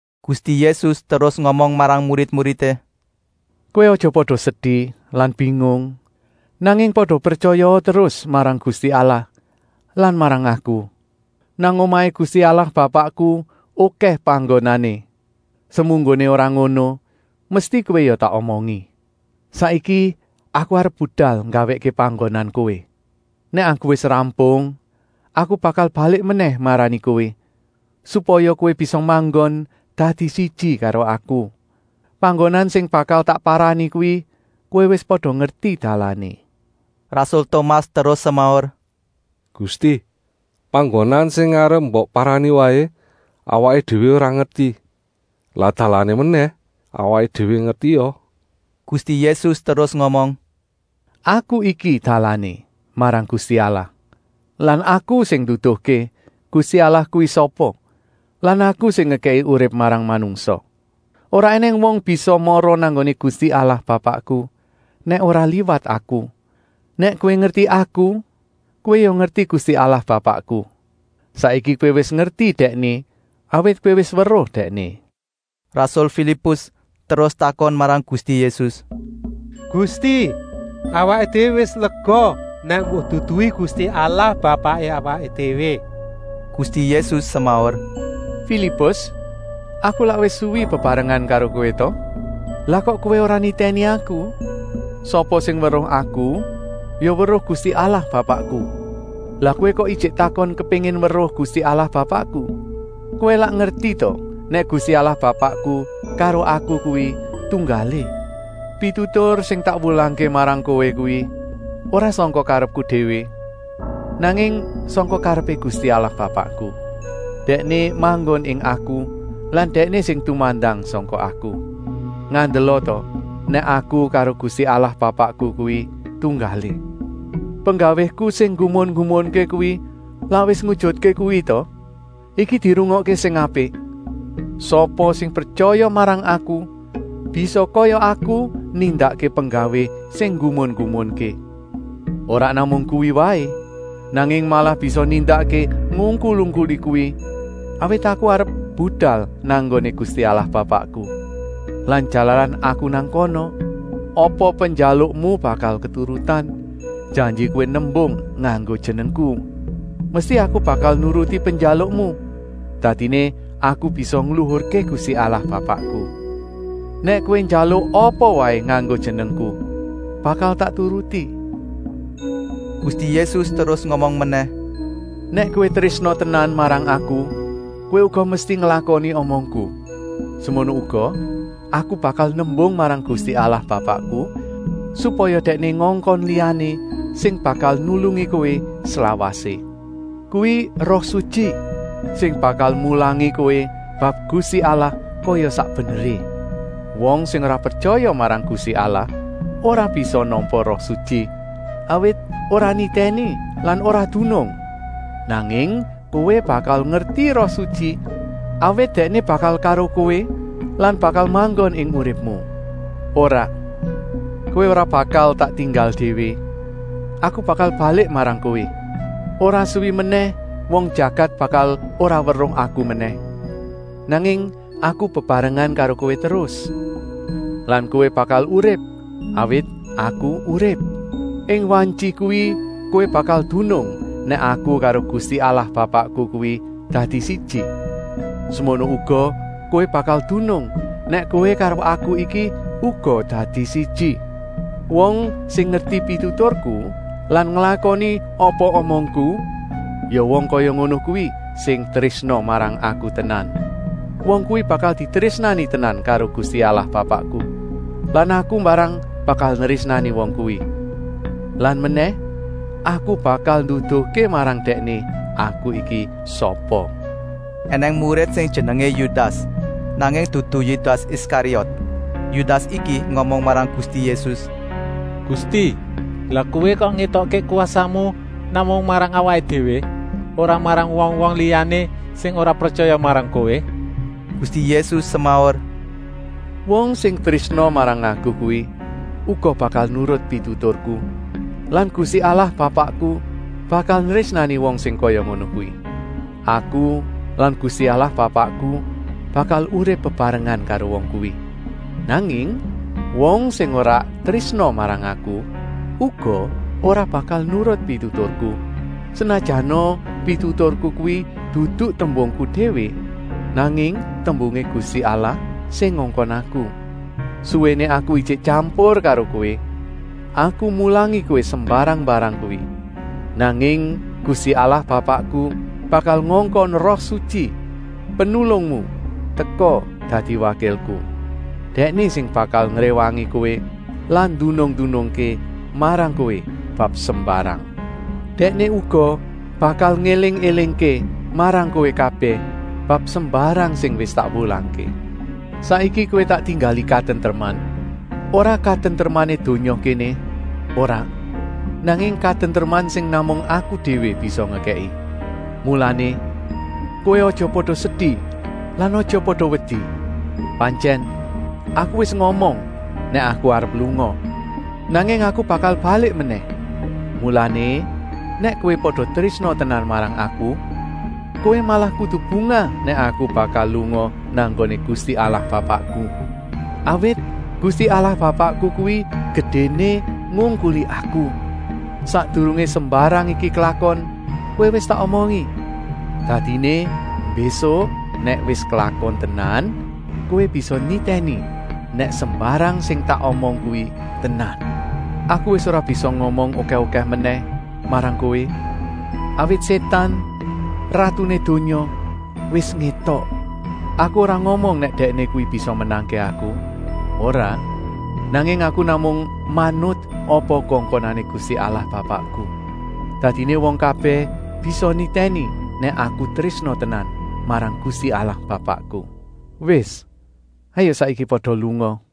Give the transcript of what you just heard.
Gusti Yésus terus ngomong marang murid-muridé: “Kowé aja pada sedi lan bingung, nanging pada pretyaya terus marang Gusti Allah lan marang Aku. Nang omahé Gusti Allah Bapakku okèh panggonané. Semunggoné ora ngono mesti kowé ya tak omongi. Saiki Aku arep budal nggawèkké panggonan kowé. Nèk Aku wis rampung Aku bakal balik menèh marani kowé, supaya kowé bisa manggon dadi siji karo Aku. Panggonan sing bakal tak parani kuwi kowé wis pada ngerti dalané!” Rasul Tomas terus semaur: “Gusti, panggonan sing arep mbok parani waé awaké déwé ora ngerti, lah dalané menèh awaké déwé ngertia.” Gusti Yésus terus ngomong: “Aku iki dalané marang Gusti Allah lan Aku sing nduduhké Gusti Allah kuwi sapa lan Aku sing ngekèki urip marang manungsa. Ora ènèng wong bisa mara nang nggoné Gusti Allah Bapakku nèk ora liwat Aku. Nèk kowé ngerti Aku kowé ya ngerti Gusti Allah Bapakku. Saiki kowé wis ngerti Dèkné, awit kowé wis weruh Dèkné. Rasul Filipus terus takon marang Gusti Yésus: Gusti, awaké déwé wis lega nèk mbok duduhi Gusti Allah Bapaké awaké déwé!” Gusti Yésus semaur: “Filipus, Aku lak wis suwi bebarengan karo kowé ta? Lah kok kowé ora nitèni Aku? Sapa sing weruh Aku ya weruh Gusti Allah Bapakku. Lah kowé kok ijik takon kepéngin weruh Gusti Allah Bapakku? Kowé lak ngerti ta nèk Gusti Allah Bapakku karo Aku kuwi tunggalé. Pitutur sing tak wulangké marang kowé kuwi ora sangka karepku déwé, nanging sangka karepé Gusti Allah Bapakku. Dèkné manggon ing Aku lan Dèkné sing tumandang sangka Aku. Ngandela ta nèk Aku karo Gusti Allah Bapakku kuwi tunggalé. Penggawéku sing nggumun-nggumunké kuwi lak wis ngujutké kuwi ta! Iki dirungokké sing apik: sapa sing pretyaya marang Aku bisa kaya Aku nindakké penggawé sing nggumun-nggumunké. Ora namung kuwi waé, nanging malah bisa nindakké ngungkul-ungkuli kuwi, awit Aku arep budal nang nggoné Gusti Allah Bapakku. Lan jalaran Aku nang kana, apa penjalukmu bakal keturutan, janji kowé nembung nganggo Jenengku. Mesti Aku bakal nuruti penjalukmu, dadiné Aku bisa ngluhurké Gusti Allah Bapakku. Nèk kowé njaluk apa waé nganggo Jenengku, bakal tak turuti.” Gusti Yésus terus ngomong menèh: “Nèk kowé trésna tenan marang Aku kowé uga mesti nglakoni omongku. Semono uga, Aku bakal nembung marang Gusti Allah Bapakku, supaya Dèkné ngongkon liyané sing bakal nulungi kowé slawasé. Kuwi Roh Sutyi, sing bakal mulangi kowé bab Gusti Allah kaya sak beneré. Wong sing ora pretyaya marang Gusti Allah ora bisa nampa Roh Sutyi, awit ora nitèni lan ora dunung. Nanging kowé bakal ngerti Roh Sutyi, awit Dèkné bakal karo kowé lan bakal manggon ing uripmu. “Ora, kowé ora bakal tak tinggal déwé, Aku bakal balik marang kowé. Ora suwi menèh wong jagat bakal ora weruh Aku menèh, nanging Aku bebarengan karo kowé terus. Lan kowé bakal urip, awit Aku urip. Ing wantyi kuwi kowé bakal dunung nèk Aku karo Gusti Allah Bapakku kuwi dadi siji. Semono uga kowé bakal dunung nèk kowé karo Aku iki uga dadi siji. “Wong sing ngerti pituturku lan nglakoni apa omongku, ya wong kaya ngono kuwi sing trésna marang Aku tenan. Wong kuwi bakal ditrésnani tenan karo Gusti Allah Bapakku lan Aku mbarang bakal nrésnani wong kuwi. Lan menèh, Aku bakal nduduhké marang Dèkné Aku iki sapa.” Enèng murid sing jenengé Yudas, nanging dudu Yudas Iskariot. Yudas iki ngomong marang Gusti Yésus: “Gusti, lah Kowé kok ngétokké kwasamu namung marang awaké déwé, ora marang wong-wong liyané sing ora pretyaya marang Kowé?” Gusti Yésus semaur: “Wong sing trésna marang Aku kuwi uga bakal nurut pituturku lan Gusti Allah Bapakku bakal nrésnani wong sing kaya ngono kuwi. Aku lan Gusti Allah Bapakku bakal urip bebarengan karo wong kuwi. Nanging wong sing ora trésna marang Aku uga ora bakal nurut pituturku, senajana pituturku kuwi dudu tembungku déwé, nanging tembungé Gusti Allah sing ngongkon Aku. “Suwéné Aku ijik tyampur karo kowé Aku mulangi kowé sembarang-mbarang kuwi. Nanging Gusti Allah Bapakku bakal ngongkon Roh Sutyi, Penulungmu, teka dadi wakilku. Dèkné sing bakal ngréwangi kowé lan ndunung-ndunungké marang kowé bab sembarang. Dèkné uga bakal ngéling-élingké marang kowé bab sembarang sing wis tak wulangké. “Saiki kowé tak tinggali katentreman. Ora katentremané donya kéné, ora, nanging katentreman sing namung Aku déwé bisa ngekèki. Mulané, kowé aja pada sedi lan aja pada wedi. Pantyèn Aku wis ngomong nèk Aku arep lunga, nanging Aku bakal balik menèh. Mulané, nèk kowé pada trésna tenan marang Aku, kowé malah kudu bungah nèk Aku bakal lunga nang nggoné Gusti Allah Bapakku, awit Gusti Allah Bapakku kuwi gedéné ngungkuli Aku. Sakdurungé sembarang iki klakon kowé wis tak omongi, dadiné mbésuk nèk wis klakon tenan, kowé bisa nitèni nèk sembarang sing tak omong kuwi tenan. Aku wis ora bisa ngomong okèh-okèh menèh marang kowé, awit Sétan, ratuné donya, wis ngétok. Aku ora ngomong nèk dèkné kuwi bisa menangké Aku, ora. Nanging Aku namung manut apa kongkonané Gusti Allah Bapakku. Dadiné wong kabèh bisa nitèni nèk Aku trésna tenan marang Gusti Allah Bapakku. “Wis, hayuk saiki pada lunga!”